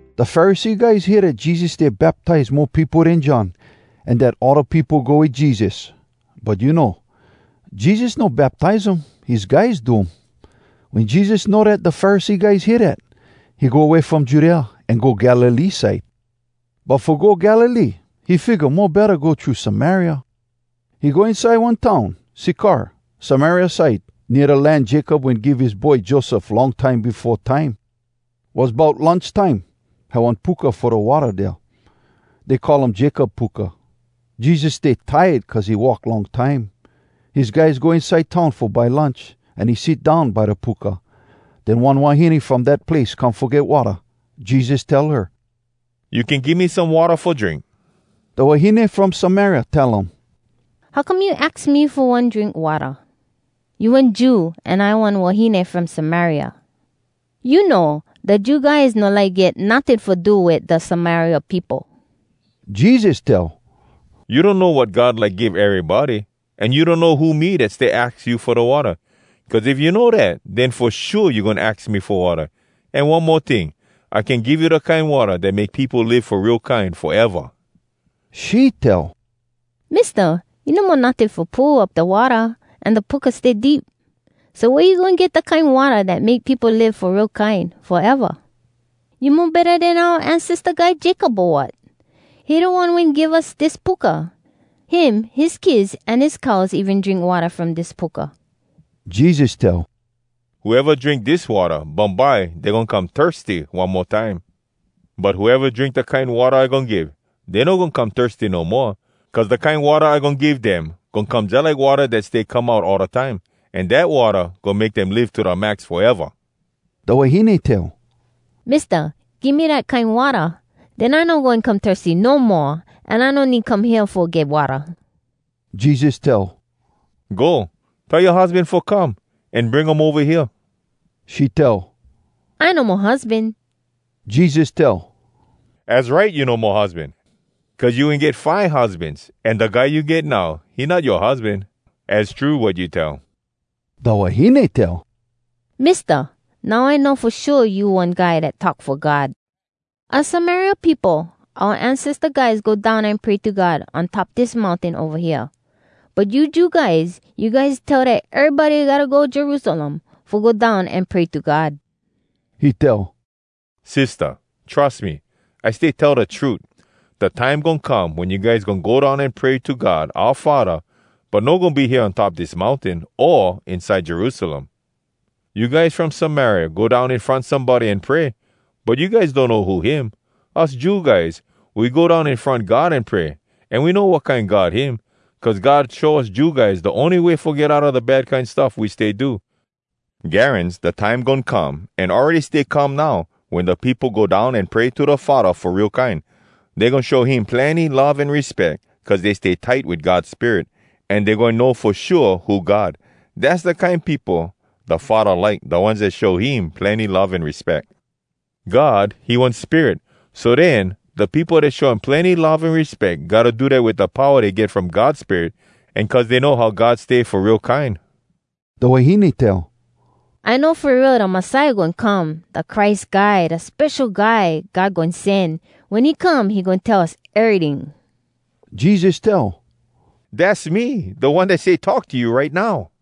Da Pharisee guys hear dat Jesus stay baptize mo peopo den John, an dat all da peopo go wit Jesus. (But you know, Jesus no baptize um, his guys do um.) Wen Jesus know dat da Pharisee guys hear dat, he go way from Judea, an go Galilee side. But fo go Galilee, he figga mo betta go thru Samaria. He go inside one town Sykar Samaria side nea da land Jacob wen give his boy Joseph long time befo time. Was bout lunch time. Had one puka fo da watta dea, dey call um Jacob Puka. Jesus stay tired cuz he walk long time. His guys go inside town fo buy lunch, an he sit down by da puka. Den one wahine from dat place come fo get watta. Jesus tell her, “You can give me some watta fo drink?” Da wahine from Samaria tell um, “How come you aks me fo one drink watta?! You one Jew an I one wahine from Samaria. You know, da Jew guys no like get notting fo do wit da Samaria peopo.” Jesus tell, “You donno wat God like give erybody, an you donno who me dat stay aks you fo da watta. Cuz if you know dat, den fo shua you goin aks me fo watta. An one mo ting, I can give you da kine watta dat make peopo live fo real kine foeva!” She tell, “Mista, you no mo notting fo pull up da watta, an da puka stay deep. So, wea you goin get da kine watta dat make peopo live fo real kine foeva? You mo betta den oua ancesta guy Jacob, o wat? He da one wen give us dis puka. Him, his kids, an his cows even drink watta from dis puka.” Jesus tell, “Whoeva drink dis watta, bumbye dey goin come thirsty one mo time. But whoeva drink da kine watta I goin give, dey no goin come thirsty no moa. Cuz da kine watta I goin give dem goin come jalike watta dat stay come out all da time. An dat watta goin make dem live to da max foeva!” Da wahine tell, “Mista, give me dat kine watta! Den I no goin come thirsty no moa, an I no need come hea fo get watta!” Jesus tell, “Go, tell yoa husban fo come, an bring um ova hea.” She tell, “I no mo husban.” Jesus tell, “Az right, you no mo husban. Cuz you wen get five husbans. An da guy you get now, he not yoa husban. Az true wat you tell!” Da wahine tell, “Mista, now I know fo shua you one guy dat talk fo God. Us Samaria peopo, oua ancesta guys go down an pray to God on top dis mountain ova hea. But you Jew guys, you guys tell dat erybody gotta go Jerusalem fo go down an pray to God.” He tell, “Sistah, trus me, I stay tell da trut. Da time goin come wen you guys goin go down an pray to God oua Faddah, but no goin be hea on top dis mountain o inside Jerusalem. You guys from Samaria go down in front somebody an pray, but you guys donno who him. Us Jew guys, we go down in front God an pray, an we know wat kine God him. Cuz God show us Jew guys da ony way fo get outa da bad kine stuff we stay do. Garans da time goin come, an awready stay come now, wen da peopo go down an pray to da Faddah fo real kine. Dey goin show him plenny love an respeck cuz dey stay tight wit God Spirit, an dey goin know fo shua who God. Dass da kine peopo da Faddah like, da ones dat show him plenny love an respeck. God, he one spirit. So den, da peopo dat show him plenny love an respeck gotta do dat wit da powa dey get from God Spirit, an cuz dey know how God stay fo real kine.” Da wahine tell, “I know fo real da Messiah goin come, da Christ Guy, da Spesho Guy God Goin Sen. Wen he come, he goin tell us eryting.” Jesus tell, “Dass me, da One dat stay talk to you right now.”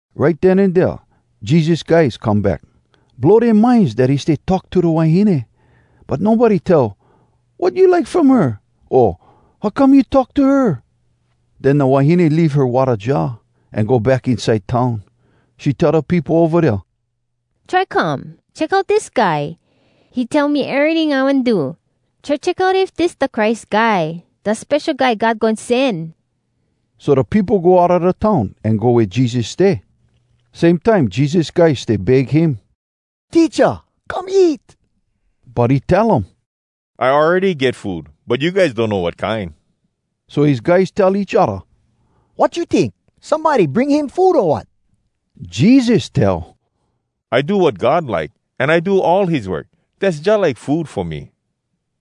Right den an dea Jesus guys come back. Blow dea minds dat he stay talk to da wahine. But nobody tell, “Wat you like from her?” o “How come you talk to her?” Den da wahine leave her watta jar, an go back inside town. She tell da peopo ova dea, “Try come! Check out dis guy! He tell me eryting I wen do. Try check out if dis da Christ Guy, da Spesho Guy God Goin Sen!” So da peopo go outa da town an go wea Jesus stay. Same time Jesus guys stay beg him, “Teacha, come eat!” But he tell um, “I awready get food, but you guys donno wat kine.” So his guys tell each odda, “Wat you tink? Somebody bring him food, o wat?” Jesus tell, “I do wat God like, an I do all his work. Dass jalike food fo me.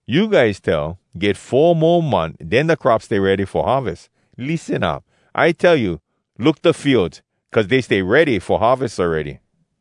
You guys tell, ‘Get four mo month, den da crop stay ready fo harves.’ Lissen up! I tell you: Look da fields, cuz dey stay ready fo harves awready.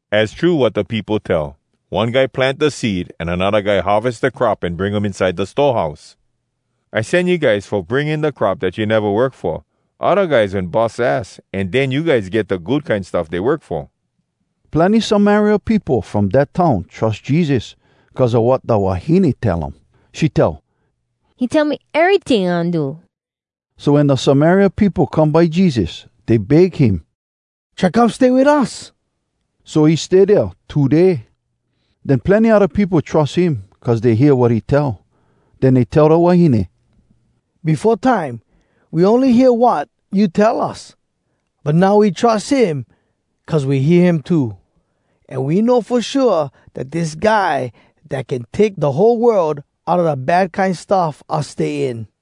Az true wat da peopo tell, ‘One guy plant da seed an anodda guy harves da crop an bring um inside da store house.’ I sen you guys fo bring in da crop dat you neva work fo. Odda guys wen bus ass, an den you guys get da good kine stuff dey work fo.” Plenny Samaria peopo from dat town trus Jesus cuz a wat da wahine tell um. She tell, “He tell me eryting I wen do.” So wen da Samaria peopo come by Jesus, dey beg him, “Try come stay wit us!” So he stay dea two day. Den plenny odda peopo trus him, cuz dey hear wat he tell. Den dey tell da wahine, “Befo time, we ony hear wat you tell us. But now we trus him cuz we hear him too, an we know fo shua dat dis da Guy dat can take da whole world outa da bad kine stuff us stay in.”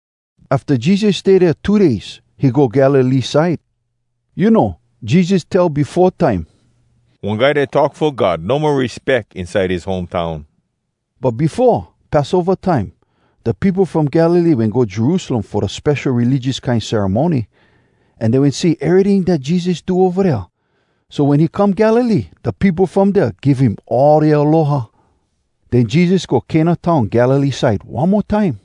Afta Jesus stay dea two days, he go Galilee side. You know, Jesus tell befo time, “One guy dat talk fo God no mo respeck inside his home town.” But befo, Passova time, da peopo from Galilee wen go Jerusalem fo da spesho religious kine ceremony. An dey wen see eryting dat Jesus do ova dea. So wen he come Galilee, da peopo from dea give him all dea aloha. Den Jesus go Cana town Galilee side one mo time.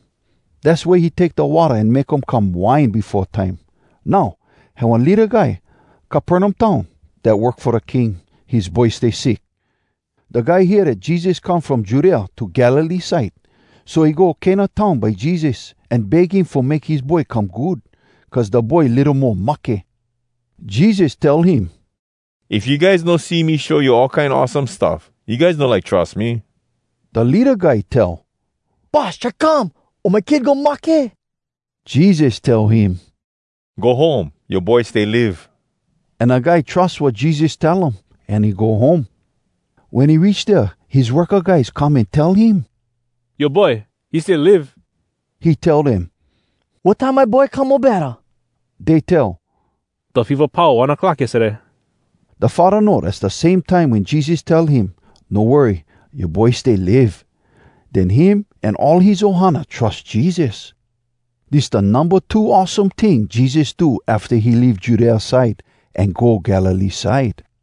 Dass wea he take da watta an make um come wine befo time. Now, had one leada guy Capernaum town dat work fo da King. His boy stay sick. Da guy hear dat Jesus come from Judea to Galilee side. So he go Cana town by Jesus, an beg him fo make his boy come good, cuz da boy litto mo mahke. Jesus tell him, “If you guys no see me show you all kine awesome stuff, you guys no like trus me.” Da leada guy tell, “Boss, try come, o my kid goin mahke.” Jesus tell him, “Go home. Yoa boy stay live.” An da guy trus wat Jesus tell um, an he go home. Wen he reach dea his worka guys come an tell him, “Yoa boy, he stay live!” He tell dem, “Wat time my boy come mo betta?” Dey tell, “Da feva pau one clock yestaday.” Da faddah know dass da same time wen Jesus tell him, “No worry. Yoa boy stay live.” Den him an all his ohana trus Jesus. Dis da numba two awesome ting Jesus do afta he leave Judea side an go Galilee side.